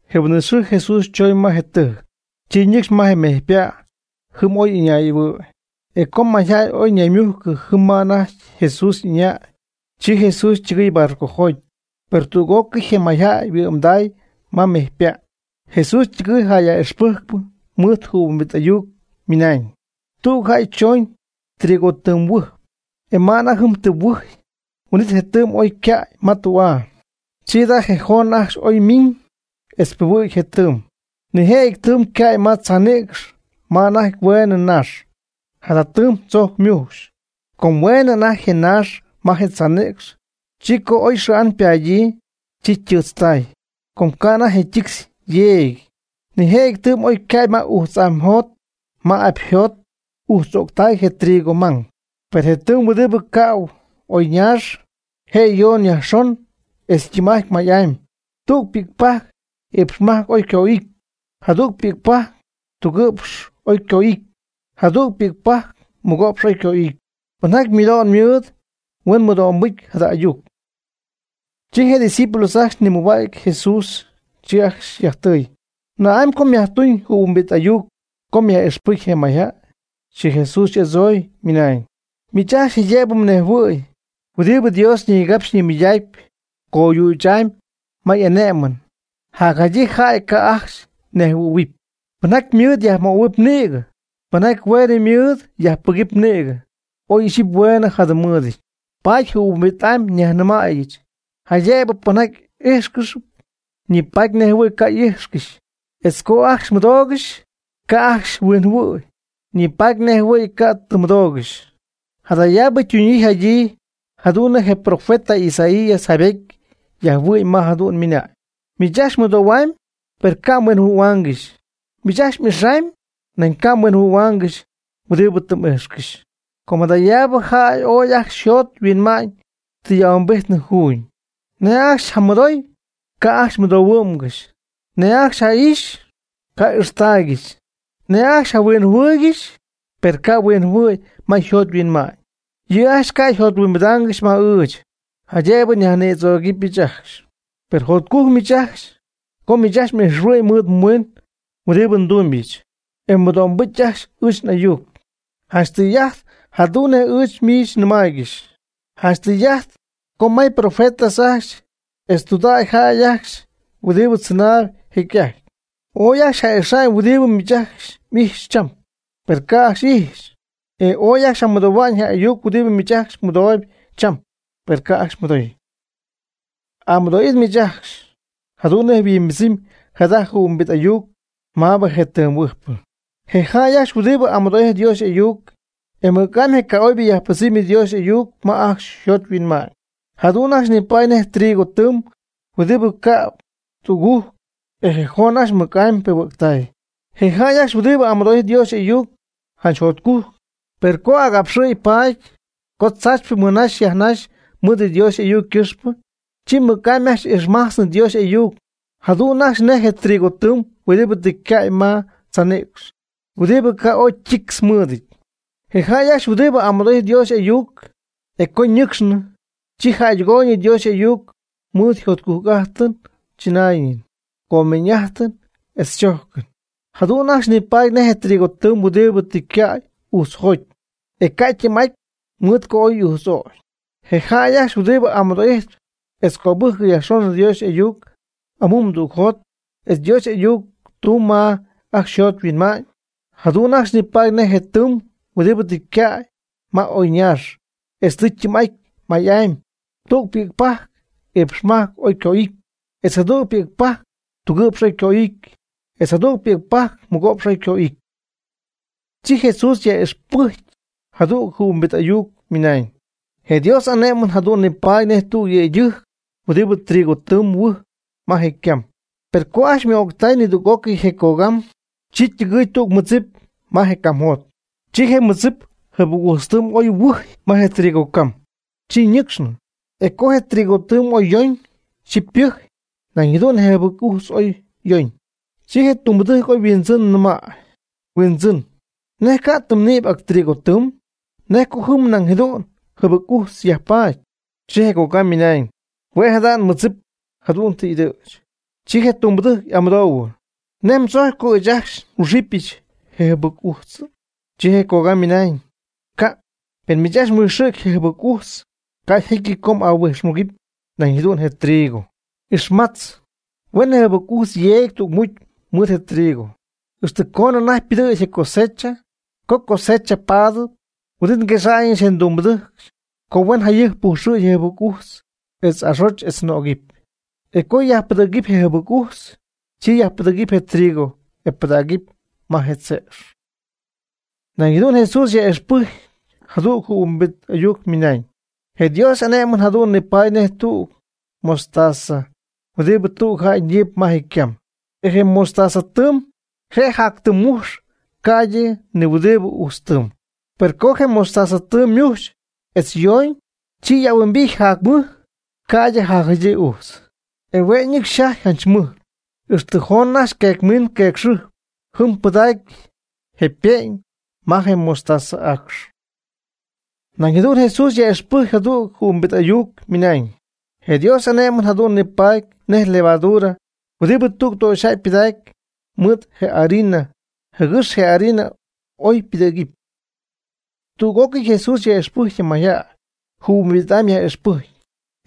Je huin'it xɨɨ Jesús choñ ma je tɨjc. Chi ñɨcxy ma je mejypa' jɨm oy y'ɨñay'ɨhuɨ̈y. E co mayjäy ooy ñaymujcɨ jɨm ma anajty Jesús ɨñay, chi Jesús ytɨgɨy barcojoty. Per tüg'ócɨy je mayjäy yhuɨ'mday ma mejypa'. Jesús ytɨgɨɨy jäy yaj'ixpɨjcp mɨɨd jɨhuimbit ayuc, ymɨnañ: ―Tüg jäy chooñ trigotɨɨm huɨjp. E ma anajty jɨm ytɨɨmhuɨjy, huin'it je ytɨɨm oy naagɨty ycäy ma tü'aa. Chi jada' je joon ajcxy oy ymiiñ etz ypiihuɨ̈gy je tɨɨm. Nijëjɨty ytɨɨm ycäy ma tzaanïcx ma anajty hueenɨ naax. Jada tɨɨm tzojc ymujxy. Com hueenɨ anajty je naax ma je tzaanïcx, chi co oy xɨɨ'an ypadyii, chi ytɨɨtztay, com ca' anajty je ytictz yeegɨty. Nijëjɨty tɨɨm oy ycäy ma ujtz'aayjot ma apyjot, e ujtz'öctay je trigo mang. Per je tɨɨm huɨdibɨ ca'u ma oy ñaax, je' yon yajxon e tɨɨm'ajt may'amy; tüg ypi'cpajc iipxmajc oy yco'ity, jadüg pi'cpajc tugɨ'px oy yco'ity, jadüg pi'cpajc mɨgo'px oy yco'ity. Pinjaty mɨdo'n mɨɨd huen mɨdo'mbɨcy jada ayuc. Chi je' ydiscípulos ajcxy nimɨjhua'cy Jesús, chi ajcxy yajtɨɨy: ―¿Na'amy co myajtuñ jɨhuimbit ayuc co myaj'ixpɨcy je mayjäy? Chi Jesús y'adzooy, ymɨnañ: ―Miich ajcxy jaydëb mnejhuɨ̈huɨpy huɨdibɨ Dios ñigapxyp ñimɨydacpy coyüch'amy ma y'ane'mɨn. Jacjadyii jäy ca' ajcxy huinjɨhuɨ̈huɨpy. Pɨnjaty ymɨɨd yajmöhuɨp nïgɨ, pɨnjaty hueen mɨɨd yajpɨgɨpy nïgɨ, oy ixyipy hueen jadɨm mɨɨdɨty. Paady jɨhuimbit'amy nyajnɨmaayɨch; jaydëbɨ pɨnjaty ijxcɨxy, ñipatpy nejɨhuɨ̈y ca' tɨ ijxcɨxy; etz co ajcxy mɨdoogɨxy, ca' ajcxy huinjɨhuɨ̈y, ñipatpy nejɨhuɨ̈y ca' tɨ mɨdoogɨxy. Jadayaabɨ ytunyii yjadyii jadu'n nej je profeta Isaías jaaybejty yajhuɨ'my ma jadu'n ymɨnañ: Miich ajcxy mɨdohuamy, per ca' mhuinjɨhuɨ̈huangɨxy. Miich ajcxy m'ixamy, nañ ca' mhuinjɨhuɨ̈huaangɨxy huɨdibɨ tɨ m'ijxcɨxy. Com jadayaabɨ jäy ooy ajcxy yjot yhuinma'ñ tɨ y'ahuimbity juuñ. Nej ajcxy yjamɨdoy, ca' ajcxy ymɨdohuɨ'mgɨxy. Nej ajcxy ja'ixy, ca' y'ijxhuɨ'mgɨxy. Nej ajcxy yjahuinjɨhuɨɨygɨxy, per ca' yhuinjɨhuɨ̈y ma yjot yhuinma'ñ. Yɨ' ajcxy ca' yjothuimbidaangɨxy ma ɨɨch, jaydëb nyajnïdzögɨbɨch ajcxy. Per jotcujc miich ajcxy, co miich ajcxy ijxhuɨ'my mɨɨd mhuiin huɨdibɨ ndumybɨch, e mmɨdo'mbɨcy ajcxy ɨɨch n'ayuc. Janch tɨy'ajt jadu'n nej ɨɨch miich nɨmaaygɨxy. Janch tɨy'ajt co may profetas ajcxy etz tudägy jäy ajcxy huɨdibɨ tzɨnaayb jecy'ajty, ooy ajcxy ja'ixañ huɨdibɨ miich ajcxy m'ijxyp cham, per ca' ajcxy ixy. E ooy ajcxy jamɨdohuañ je ayuc huɨdibɨ miich ajcxy mɨdooyb cham, per ca' ajcxy mɨdoy. Amɨdo'it miich ajcxy, jadu'n nej yhuimbɨdzɨmy jada jɨhuimbit ayuc maabɨ je tɨɨm huɨjpɨ. Je jäy ajcxy huɨdibɨ amɨdo'ijtp Dios y'ayuc, e mɨc'amy je ca'oybɨ yajpɨdzɨmy Dios y'ayuc ma ajcxy yjot yhuinma'ñ, jadu'n ajcxy nipaady nej trigo tɨɨm huɨdibɨ cäb tügujc, e je joon ajcxy mɨc'amy ypiimujctay. Je jäy ajcxy huɨdibɨ amɨdo'ijtp Dios y'ayuc janch jotcujc, per co agapxɨɨyb paady, co tzaachypɨ mɨnaxy yajnaxy mɨɨd Dios y'ayuc ycɨxpɨ, chi mɨc'amy ajcxy ixmajtznɨ Dios y'ayuc, jadu'n ajcxy nej je trigotɨɨm huɨdibɨ tɨ ycäy ma tzaanïcx, huɨdibɨ ca' oy ytictz mɨɨdɨty. Je jäy ajcxy huɨdibɨ amɨdo'ijtp Dios y'ayuc, e co ñɨcxnɨ, chi jäydɨgooyñɨ Dios y'ayuc mɨɨd jotcujc'ajtɨn tzɨnaayɨn, comeeñ'ajtɨn etz adzojcɨn. Jadu'n ajcxy nipaady nej trigotɨɨm huɨdibɨ tɨ ycäy ujtzjoty, e ca' ytɨɨm'aty mɨɨd co oy y'ujtz'ögy. Je jäy ajcxy huɨdibɨ amɨdo'ijtp etz cöbɨjcp yajxon Dios y'ayuc amumdügjot etz Dios y'ayuc ytumyb ma ajcxy yjot yhuinma'ñ, jadu'n ajcxy nipaady nej je tɨɨm huɨdibɨ tɨ ycäy ma oy ñaax etz tɨ ytɨɨm'aty may'amy. Tüg pi'cpajc iipx majc oy yco'ity, etz jadüg pi'cpajc tugɨ'px oy yco'ity, etz jadüg pi'cpajc mɨgo'px oy yco'ity. Chi Jesús yaj'ixpɨjcy jadüg jɨhuimbit ayuc, ymɨnañ: ―Je Dios y'ane'mɨn jadu'n nipaady nej tüg yëydɨjc huɨdibɨ trigo tɨɨm huɨjp ma je' ycam. Per co ajcxy yma'öctay nidüg'ócɨy je cogam, chi ytɨgɨɨy tüg ymɨdzip ma je ycamjot. Chi je mɨdzip jɨbɨc ujtz tɨɨm oy huɨjy ma je trigo cam. Chi ñɨcxñɨ. E co je trigo oy yooñ, chi ypɨjy. Nañ jadu'n je jɨbɨc ujtz oy yooñ. Chi je ytumbɨdɨjc oy yhuindzɨn yajnɨmay: “Huindzɨn, ¿nej ca' tɨ mnïpy ac trigotɨɨm? ¿Nej co jɨm nañ jadu'n jɨbɨc ujtz yajpaady?” Chi je cogam ymɨnañ: “Huen jada' nmɨdzipɨch jadu'n tɨ y'ɨdɨ̈ch.” Chi je tumbɨdɨjc y'amɨdoohuɨ: “¿Nej mdzojcpy co ɨɨch ajcxy nhuijxɨ̈gɨbɨch je jɨbɨc ujtzɨ?” Chi je cogam ymɨnañ: “Ca'. Pen miich ajcxy mhuijxɨ̈cpy je jɨbɨc ujtz, ca' jecyɨty co m'ahuijxmugɨpy nañ jadu'n je trigo. Ixmatz, huen je jɨbɨc ujtz yeegy tügmucy mɨɨd je trigo, ixtɨ coonɨ anajty ypɨdɨ̈gy je cosecha. Co cosecha paty, huin'it nguexa'ñɨch je ndumbɨdɨjc co huen jayɨjp pujxɨ̈gy je jɨbɨc ujtz etz axotzɨpy etz nögɨpy. E co yajpɨdɨ̈ctay je jɨbɨc ujtz, chi yajpɨdɨ̈gɨpy je trigo e pɨdägɨpy ma je tze'x.” Nañ jadu'n Jesús yaj'ixpɨjcy jadüg jɨhuimbit ayuc, ymɨnañ: ―Je Dios y'ane'mɨn jadu'n nipaady nej tüg mostazapajc huɨdibɨ tüg jäy ñiip ma je' ycam. E je mostaza ytɨɨm je' jac tɨm mutz ca'ydɨ ni huɨdibɨ ujtz tɨɨm. Per co je mostaza ytɨɨm ymujx etz yoñ, chi y'ahuimbijty jac mɨj ca'ydɨ jacjadyii ujtz. E hue' nɨcxy yjaty janch mɨj, ixtɨ joon ajcxy oy yqueec miiñ yqueec xɨjpy jɨm, pɨdägy je ype'ñ ma je mostaza y'aacx. Nañ jadu'n Jesús yaj'ixpɨjc jadüg jɨhuimbit ayuc, ymɨnañ: ―Je Dios y'ane'mɨn jadu'n nipaady nej levadura huɨdibɨ tüg töxyjäy ypɨdacpy mɨɨd je harina, jɨgɨx je harina oy ypɨdɨ̈gy. Tüg'ócɨy Jesús yaj'ixpɨjc je mayjäy, jɨhuimbit'amy yaj'ixpɨjc,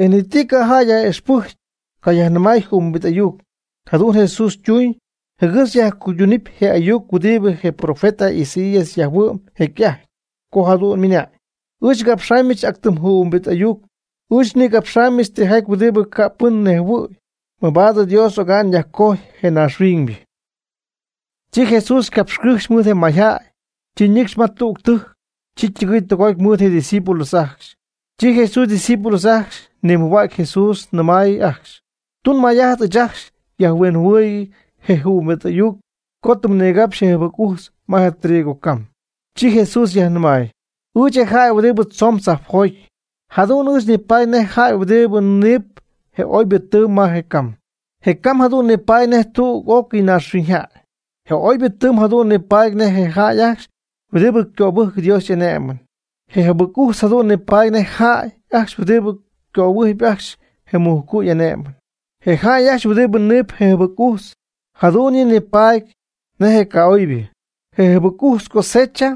e ni ti ca' jäy yaj'ixpɨjcy cayajnɨmäy jɨhuimbit ayuc. Jadu'n Jesús ytuuñ, jɨgɨx yajcuyduñ je ayuc huɨdibɨ je profeta Isaías yjaayhuɨ'm jecy'ajty, co jadu'n ymɨnañ: Ɨɨch ngapxamyɨch ac tɨm jɨhuimbit ayuc. Ɨɨch nigapxamybɨch tijaty huɨdibɨ ca' pɨn nejhuɨ̈y, mabaad Dios oga'n yajcojy je naaxhuiñybɨ. Chi Jesús capxycɨjxy mɨɨd je mayjäy, chi ñɨcxy ma tüg tɨjc. Chi ytɨgɨy tɨgoty mɨɨd je' ydiscípulos ajcxy. Chi Jesús ydiscípulos ajcxy nimɨjhua'cy Jesús, ymɨnañ ajcxy: ―Tun may'ajt ɨɨch ajcxy xyajhuinjɨhuɨɨyg je jɨhuimbit ayuc co tɨ mnigapxy je jɨbɨc ujtz ma je trigo cam. Chi Jesús yajnɨmay: ―Ɨɨch, je jäy huɨdibɨ tzoon tzajpjoty, jadu'n ɨɨch nipaady nej je jäy huɨdibɨ niip je oybɨ tɨɨm ma je ycam. Je cam jadu'n nipaady nej tüg'ócɨy naaxhuiñyjäy. Je oybɨ tɨɨm jadu'n nipaady nej je jäy ajcxy huɨdibɨ cöbɨjcp Dios y'ane'mɨn. Je jɨbɨc ujtz jadu'n nipaady nej je jäy ajcxy huɨdibɨ cöbɨjcy ajcxy je mujcu' y'ane'mɨn. Je jäy huɨdibɨ niipy je jɨbɨc ujtz, jadu'n yɨ' nipaady nej je ca'oybɨ. Je jɨbɨc ujtz cosecha,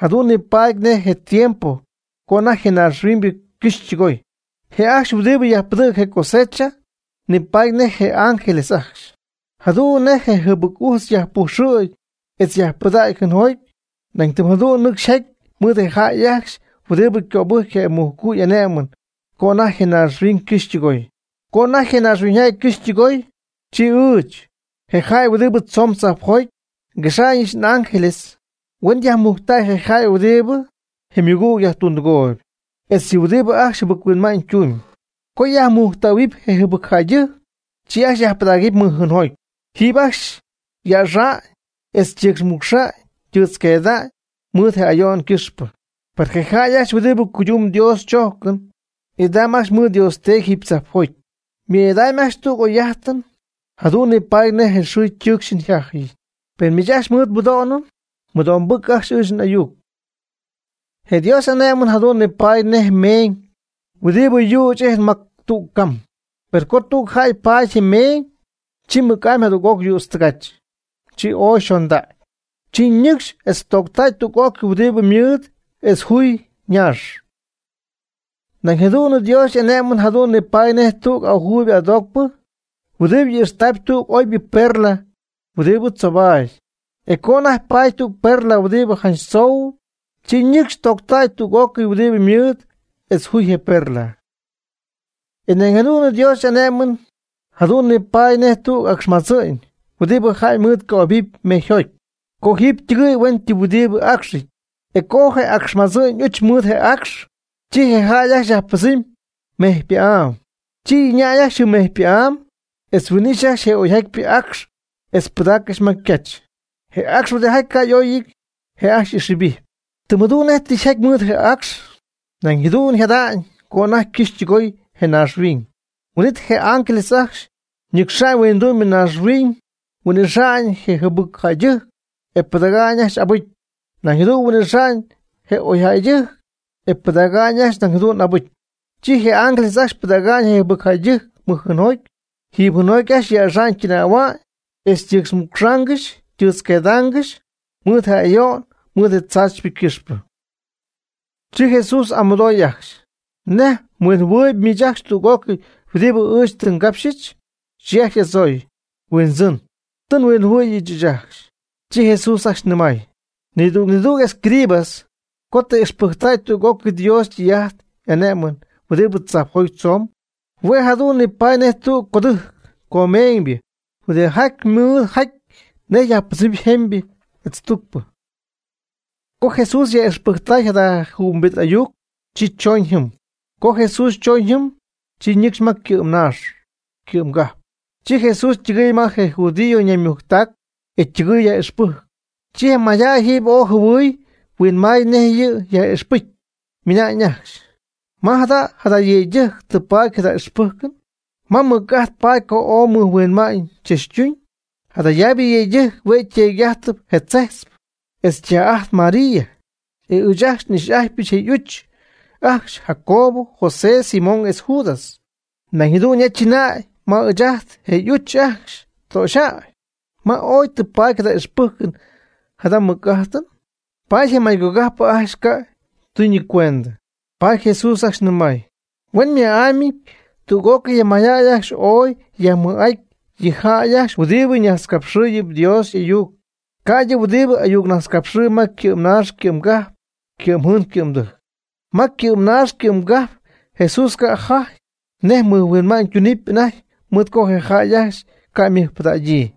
jadu'n nipaady nej je tiempo co anajty je naaxhuiñ ycɨxy ytɨgoy. Je ajcxy huɨdibɨ yajpɨdɨ̈c je cosecha, nipaady nej je ángeles ajcxy. Jadu'n nej je jɨbɨc ujtz oy yajpujxɨ̈gy etz yajpɨdacy jɨɨnjoty, nañ tɨm jadu'n nɨcxy yjaty mɨɨd je jäy ajcxy huɨdibɨ cöbɨjcp je mujcu' y'ane'mɨn co anajty je naaxhuiñ cɨxy ytɨgoy. Co anajty je naaxhuiñ ycɨxy ytɨgoy, chi ɨɨch, je jäy huɨdibɨ tzoon tzajpjoty, nguexamyɨch n'ángeles huen yajmujctäy je jäy huɨdibɨ je ymɨgüg yajtundɨgooyb, etz yɨ huɨdibɨ ajcxy jɨbɨc-huinma'ñ tumb. Co yajmujctähuɨpy je jɨbɨcjäydɨjc, chi ajcxy yajpɨdägɨpy mɨjjɨɨnjoty, jiiby ajcxy yäxa'ñ etz ytɨɨtzmucxy ytɨɨtzqueecy mɨɨd je ayo'n ycɨxpɨ. Per je jäy ajcxy huɨdibɨ cuydumb Dios chojcɨn, idam ajcxy mɨɨd Dios Teedy jiiby tzajpjoty. Ymɨɨ'idamy ajcxy tüg oy'ajtɨ, jadu'n nipaadɨp nej je xɨɨ ytɨɨcxɨn yjajɨn. Pen miich ajcxy mɨdo'n mɨɨd, mɨdo'mbɨjc ajcxy ɨɨch n'ayuc. Je Dios y'ane'mɨn jadu'n nipaady nej meeñ huɨdibɨ yüch ijtp ma tüg cam. Per co tüg jäy paady je meeñ, chi mɨc'amy jadüg'oc yüdz tɨgach. Chi ooy yxondägy. Chi ñɨcxy etz tooctäy tüg'ócɨy huɨdibɨ ymɨɨd etz juy je naax. Nañ jadu'n Dios y'ane'mɨn jadu'n nipaady nej tüg ajuuyb adoocpɨ huɨdibɨ ijxtaayb tüg oybɨ perla huɨdibɨ tzoobatp. E co anajty paady tüg perla huɨdibɨ janch tzou, chi ñɨcxy tooctɨgoydäy tüg'ócɨy huɨdibɨ ymɨɨd etz juy je perla. E nañ jadu'n Dios y'ané'mɨn jadu'n nipaady nej tüg acxmadzɨ'ñ huɨdibɨ jäy mɨɨd ycojɨbɨɨby mejyjoty. Chi jiiby ytɨgɨy huen ytɨm huɨdibɨ acxɨty. E co anajty je acxmadzɨ'ñ y'uch mɨɨd je acx, chi je jäy ajcxy yajpɨdzɨmy ma mejypa'áy. Chi ɨñay ajcxy jɨm mejypa'áy etz huin'ijxy ajcxy je oyjatypɨ acx etz pɨdaaccɨxy ma ycach. Je acx huɨdijaty ca' y'oyɨty, je' ajcxy y'ixjɨbijp. Tɨm jadu'n nej tɨ yjaty mɨɨd je acx, nañ jadu'n jada'ñ, co anajty ycɨxy ytɨgoy je naaxhuiñ. Huin'it je ángeles ajcxy ñɨcxa'ñ huindu'my naaxhuiñ huin'ixa'ñ je jɨbɨc jäydɨjc e pɨdäga'ñ ajcxy abɨcy, nañ jadu'n huin'ixa'ñ je oy jäydɨjc, e pɨdäga'ñ ajcxy nañ jadu'n abɨcy. Chi je ángeles ajcxy pɨdäga'ñ je jɨbɨcjäydɨjc mɨj jɨɨnjoty. Jiiby jɨɨnjoty ajcxy yäxa'ñ ytɨnähua'ñ etz ytɨɨtzmucxaangɨxy ytɨɨtzqueedaangɨxy mɨɨd je ayo'n mɨɨd je tzaachypɨ ycɨxpɨ. Chi Jesús y'amɨdooy ajcxy: ―¿Nej mhuinjɨhuɨɨyb miich ajcxy tüg'ócɨy huɨdibɨ ɨɨch tɨ ngapxɨch? Chi ajcxy y'adzooy: ―Huindzɨn, tɨ nhuinjɨhuɨ̈y ɨɨch ajcxy. Chi Jesús ajcxy nɨmay: ―Nidüg nidüg escriba co tɨ ixpɨcytäy tüg'ócɨy Dios ytɨy'ajt y'ane'mɨn huɨdibɨ tzajpjoty tzoon, hue' jadu'n nipaady nej tüg codɨjc comeeñybɨ huɨdijaty ymɨɨd yjajty nej yajpɨdzɨmɨpy jemybɨ etz tucpɨ. Co Jesús yaj'ixpɨjctay jada jɨhuimbit ayuc, chi chooñ jɨm. Co Jesús chooñ jɨm, chi ñɨcxy ma ycɨ'mnaax ycɨ'mgajp. Chi Jesús ytɨgɨɨy ma je judio ñaymujctac, e ytɨgɨɨy yaj'ixpɨjcp. Chi je mayjäy jiiby ooy jɨhuɨy huinmay nej yɨ' yaj'ixpɨcy, ymɨnañ ajcxy: ―¿Ma jada' jada yëydɨjc tɨ paady jada ixpɨjcɨn? ¿Ma mɨc'ajt paady co ooy mɨjhuinma'ñ tzachtuñ? Jadayaabɨ yëydɨjc hue' yteedy'ajtpy je tzejtzpɨ, etz ytaj'ajtpy María. E ɨɨch ajcxy n'ix'ajtpyɨch je y'uch ajcxy; Jacobo, José, Simón, etz Judas. Nañ jadu'n ya chɨnay ma ɨɨch ajt je' y'uch ajcxy töxyjäy. ¿Ma oy tɨ paady jada ixpɨjcɨn jada mɨc'ajtɨn? Paady je maycogajpɨ ajcxy ca' ytunɨcuend. Paady Jesús ajcxy nɨmay: ―Huen ma'amyɨty tüg'ócɨy je mayjäy ajcxy ooy yajmɨj'aty yɨ jäy ajcxy huɨdibɨ najtzcapxɨɨyb Dios y'ayuc, ca'ydɨ huɨdibɨ y'ayucnajtzcapxɨɨyb ma ycɨ'mnaax ycɨ'mgajp ycɨ'mjɨɨn ycɨ'mdɨjc. Ma ycɨ'mnaax ycɨ'mgajp Jesús ca' jaty nej mɨjhuinma'ñ tunɨp anajty, mɨɨd co je jäy ajcxy ca' mɨjpɨdägyii.